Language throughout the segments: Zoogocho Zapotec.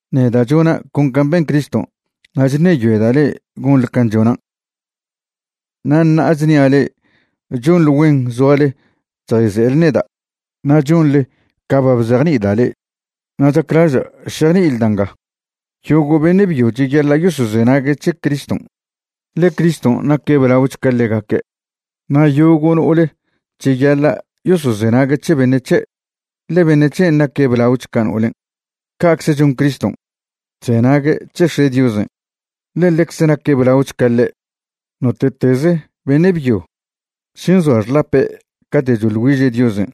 Neda' chona' con can' ben Criston', na' chṉeyoeda' le'e gonḻe can' chonan'. Na' ṉa'a chnia' le'e chonḻe güen zoale chjayze'ele neda' na' chonḻe ca ba bzejni'ida' le'e. Na' chaclaža' šejni'ile da' nga. Yogo' beṉe' byo cheyaḻa' yosozenague' c̱he Criston', ḻe Criston' naque' blaoch ca ḻegaque', na' yogo' no'ole cheyaḻa' yosozenague' c̱he beṉe' c̱he', ḻe beṉe' c̱hen' naque' blaoch ca no'olen'. Ca'cze chon Criston', chzenague' c̱he X̱e' Diosen', ḻe ḻecze naque' blaoch ca ḻe'. Note'teze beṉe' byo še nzoa xḻape' cate' choḻ güiže' Diosen'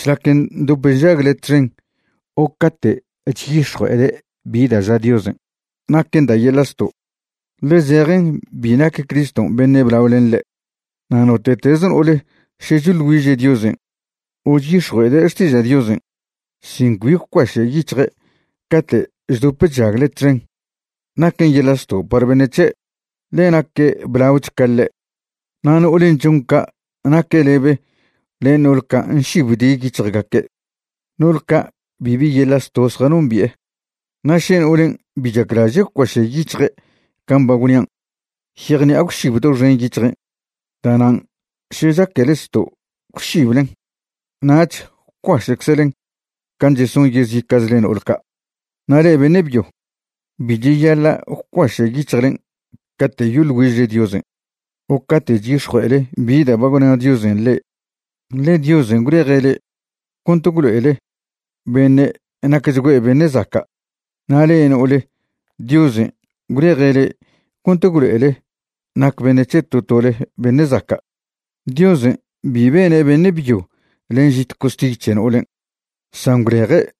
šlac ndop nžagle txen o cate' chyix̱jue'ede' bi da' ža Diosen', naquen da' yeḻa' zto', ḻe zejen bi nac Criston' beṉe' blao len ḻe'. Na' note'teze no'ole še choḻ güiže' Diosen' o chyix̱jue'ede' xtiža' Diosen' sin cbi gwcuaše' yic̱hje' cate' chdop chžagle txen, naquen yeḻa' zto' par beṉe' c̱he', ḻe naque' blaoch ca ḻe'. Na' no'olen' chon ca' naque' lebe len no'ol ca' nšibdi yic̱hjgaque', no'ole ca' bibi yeḻa' zto' zjanombi'e. Na' še no'olen' bi chaclaže' gwcuaše' yic̱hje' can' ba gwnian', yejṉi'a gwšib doxen yic̱hjen'. Da'nan' še chaquele zto' gwšiblen, nach gwcuaše'czlen can' cheson yezica'chle no'ol ca'. Na' le'e beṉe' byo, bi cheyaḻa' gwcuaše' yic̱hjlen' cate' yoḻ güižle Diosen' o cate' c̱hix̱jue'ele bi da' ba gwna Diosen' le'e, ḻe Diosen' gwleje' le'e cont gwlo'ele beṉe' nacchgüe' beṉe' zaca'. Na' le'e no'ole, Diosen' gwleje' le'e cont gwlo'ele nac beṉe' c̱he to tole beṉe' zaca'. Diosen' bi bene' beṉe' byo len žit costiy c̱he no'olen', san gwleje'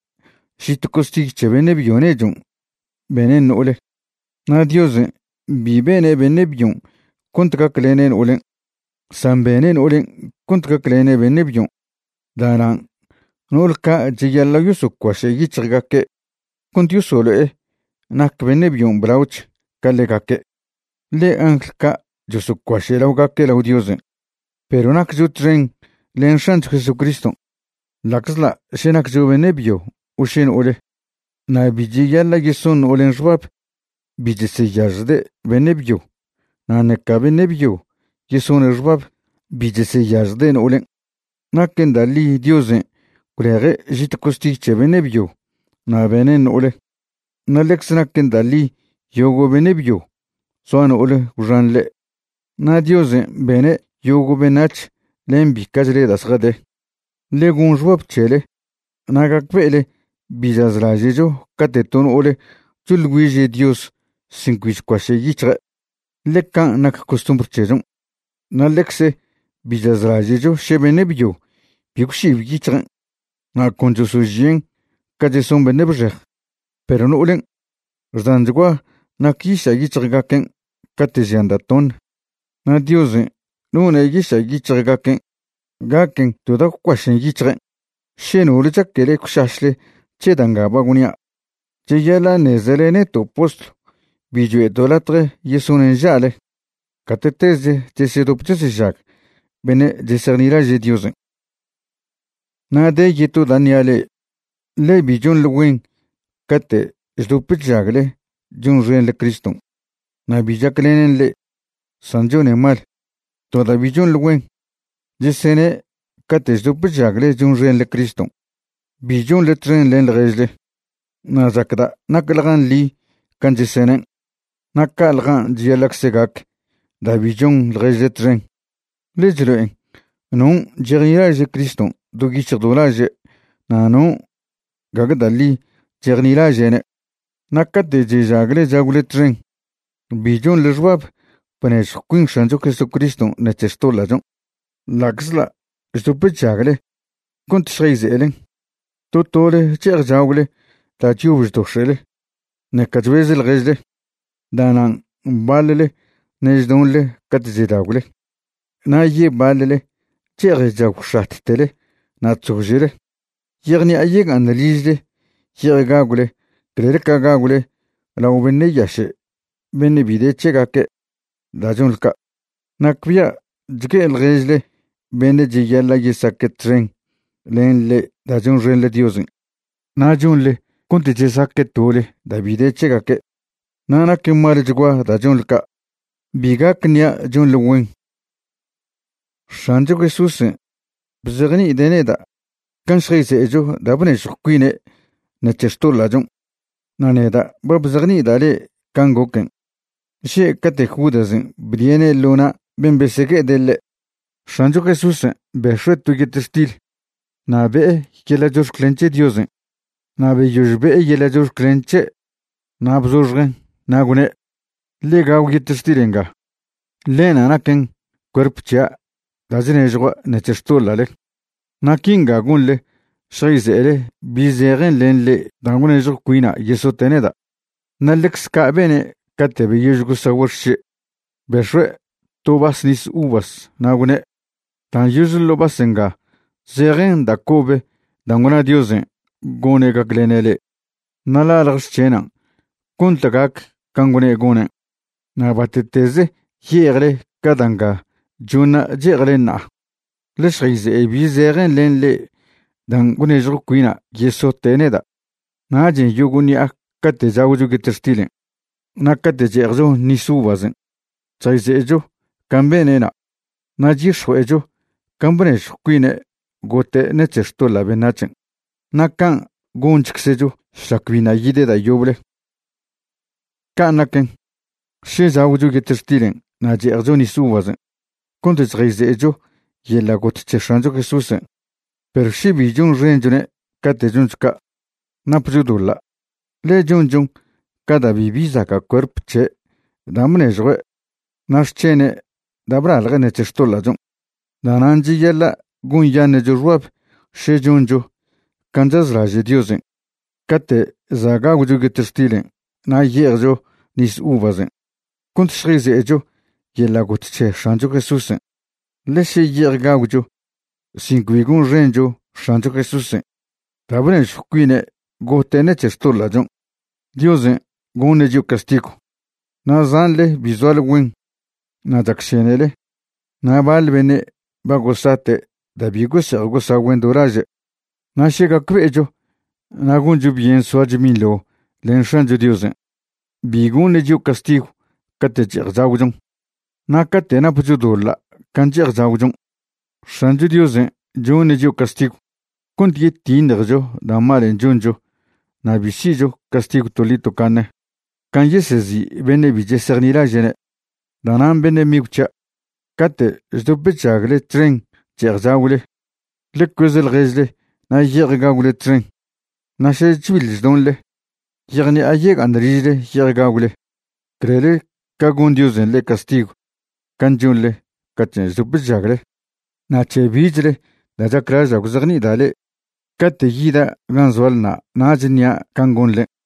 žit costiy c̱he beṉe' byo nechon' benen' no'ole. Na' Diosen' bi bene' beṉe' byon' cont gaclene' no'olen', san bene' no'olen' cont gaclene' beṉe' byon'. Da'nan' no'ol ca' cheyaḻa' yosocuaše' yic̱hjgaque' cont yosolo'e nac beṉe' byon' blaoch ca ḻegaque', ḻe angl ca' chosocuaše' laogaque' lao Diosen'. Perw naccho txen len X̱ancho Jesucriston' ḻa'czḻa' še naccho beṉe' byo o še no'ole, na' bi cheyaḻa' yeson no'olen' xbab bi cheseyažjde' beṉe' byo na' ṉeca beṉe' byo yesone' xbab bi cheseyažjde' no'olen'. Naquen da' ḻi Diosen' gwleje' žit costiy c̱he beṉe' byo na' benen' no'ole, na' ḻecze naquen da' ḻi yogo' beṉe' byo zoa no'ole gwxan ḻe', na' Diosen' bene' yogo' beṉac̱h len bica'chle da' zjade. Ḻe gon xbab c̱hele na' gacbe'ele bi chazlaže'cho cate' to no'ole choḻ güiže' Dios sin cbi chcuaše' yic̱hje', ḻe can' nac costumbr c̱hechon'. Na' ḻecze bi chazlaže'cho še beṉe' byo bi gwšib yic̱hjen' na' con chosožien' ca cheson beṉe' bxej. Perw no'olen' xdanchgua nac yiša' yic̱hjgaquen' cate' žian' da' toṉe, na' Diosen' none' yiša' yic̱hjgaquen' gaquen to da' gwcuašen' yic̱hjen'. Še nole chaquele gwšašle c̱he da' nga ba gwnia', cheyaḻa' ṉezele neto' postlw bi choe'to' latje yesone' nža'le gate'teze chesedop chesežag beṉe' chesejnilaže' Diosen'. Na' de yeto da' ṉia' le'e, ḻe bi chonḻe güen cate' chdop chžagle chonxenḻe Criston' na' bi chaclenen le'e, san chonen mal. To da' bi chonḻe güen, chesene' cate' chdop chžagle chonxenḻe Criston' bi chonḻe txen len ḻježle, na' chacda' nacḻjan' ḻi can' chesenen'. Na' ca'ḻjan' cheyaḻa'cze gac da' bi chon ḻježle txen, ḻe chlo'en non' chejnilaže' Criston' do yic̱hj do laže' na' non' gague da' ḻi chejnilaže'ne'. Na' cate' chežagle chagwle txen, bi chonḻe xbab bnežjw cuin X̱ancho Jesucriston' ṉec̱he xtoḻa'chon', ḻa'czḻa' chdop chžagle cont šjayze'elen. To tole che'ej chagwle da' chyob chdox̱e'le, ṉeca chbez ḻježle. Da'nan' baḻle ṉe' chdonḻe cate' chedagwle na' yebaḻle che'ej chagwx̱attele na' chzože'le. Yejṉi'a yega'aṉ ližle ye'ej gagwle clel ca gagwle lao beṉe' yaše' beṉe' bi de c̱hegaque'. Da' chonḻe ca', nacbia' chgue'e ḻježle beṉe' cheyaḻa' yesaque' txen len le'e da' chonxenḻe Diosen', na' chonḻe cont chesaque' tole da' bi de c̱hegaque'. Na' naquen malchgua da' chonḻe ca', bi gac ṉi'a chonḻe güen. X̱ancho Jesúsen' bzejni'ide' neda' can' šjayze'echo da' bnežjw cuine' ṉec̱he xtoḻa'chon'. Na' neda' ba bzejni'ida' le'e can' goquen', že' cate' Judasen' bdie'ne' ḻo na' ben' besegue'ede' ḻe', X̱ancho Jesúsen' bex̱ue' to yetextil. Na' be'e yeḻa' chox̱clen c̱he Diosen' na' beyož be'e yeḻa' chox̱clen c̱he' na' bzoxjen', na' gwne': “Ḻe gagw yetextil nga. Ḻenṉa' naquen cuerp c̱hia' da' chnežjua' ṉec̱he xtoḻa'le. Na' quinga gonḻe šjayze'ele bi zejen len le'e dan' gwnežjw cuina' yesote' neda'.” Na' ḻecze ca' bene' cate' beyož gosagüe' xše', bex̱ue' to vas nis uvas na' gwne': “Dan' yože ḻo vas nga zejen da' cobe dan' gwna Diosen' gone' gaclene' le'e. Na' ḻalje xc̱henan' cont gac can' gwne' gonen'. Na' bate'teze ye'ejle ca da' nga choṉa' che'ejle ṉa'a, ḻe šjayze'e bi zejen len le'e dan' gwnežjw cuina' yesote' neda'.” Nachen' yogo' ṉi'a cate' chagwcho yetextilen' na' cate' che'ejcho nis uvasen' chjayze'echo can' bene'na', na' chyix̱jue'echo can' bnežjw cuine' gote' ṉec̱he xtoḻa' beṉac̱hen'. Na' can' gonchczcho šlac biṉa' yide' da' yoble. Can' naquen, še chagwcho yetextilen' na' che'ejcho nis uvasen' cont chjayze'echo yeḻa' got c̱he X̱ancho Jesúsen' perw še bi chonxenchone' cate' choncho ca', napcho doḻa', ḻe chonchon ca da' bibi zaca' cuerp c̱he' dan' bnežjue' na' xc̱hene' da' blalje' ṉec̱he xtoḻa'chon'. Da'nan' cheyaḻa' gonyaṉe'cho xbab še choncho can' chazlaže' Diosen' cate' za' gagwcho yetextilen' na' ye'ejcho nis uvasen' cont šjayze'echo yeḻa' got c̱he X̱ancho Jesúsen'. Ḻe še ye'ej gagwcho sin cbi gonxencho X̱ancho Jesúsen' da' bnežjw cuine' gote' ṉec̱he xtoḻa'chon', Diosen' goṉe' chio' castigw. Na' zanḻe bi zoale güen na' chacšenele na' baḻ beṉe' ba gosate' da' bi gose'ej gosagüen' do laže'. Na' še gacbe'echo na' goncho byen soacho binḻo len X̱ancho Diosen', bi goṉe' chio' castigw cate' che'ej chagwchon. Na' cate' napcho doḻa' can' che'ej chagwchon, X̱ancho Diosen' choṉe' chio' castigw cont yetiṉjecho da' malen' choncho na' bi si'cho castigw toḻi tocaṉe can' yesezi' beṉe' bi chesejnilaže'ne'. Da'nan' beṉe' migw c̱hia', cate' chdop chžagle txen che'ej chagwle, ḻe cueze ḻježle na' ye'ej gagwle txen. Na' še chbiḻ chdonḻe, yejṉi'a yega'aṉ ližle ye'ej gagwle, clel ca gon Diosen' le'e castigw can' chonḻe caten' chdop chžagle. Na' c̱he bichle da' chaclaža' gwzejni'ida' le'e, cate' yida' gan' zoalena' nach ṉia' can' gonḻen'.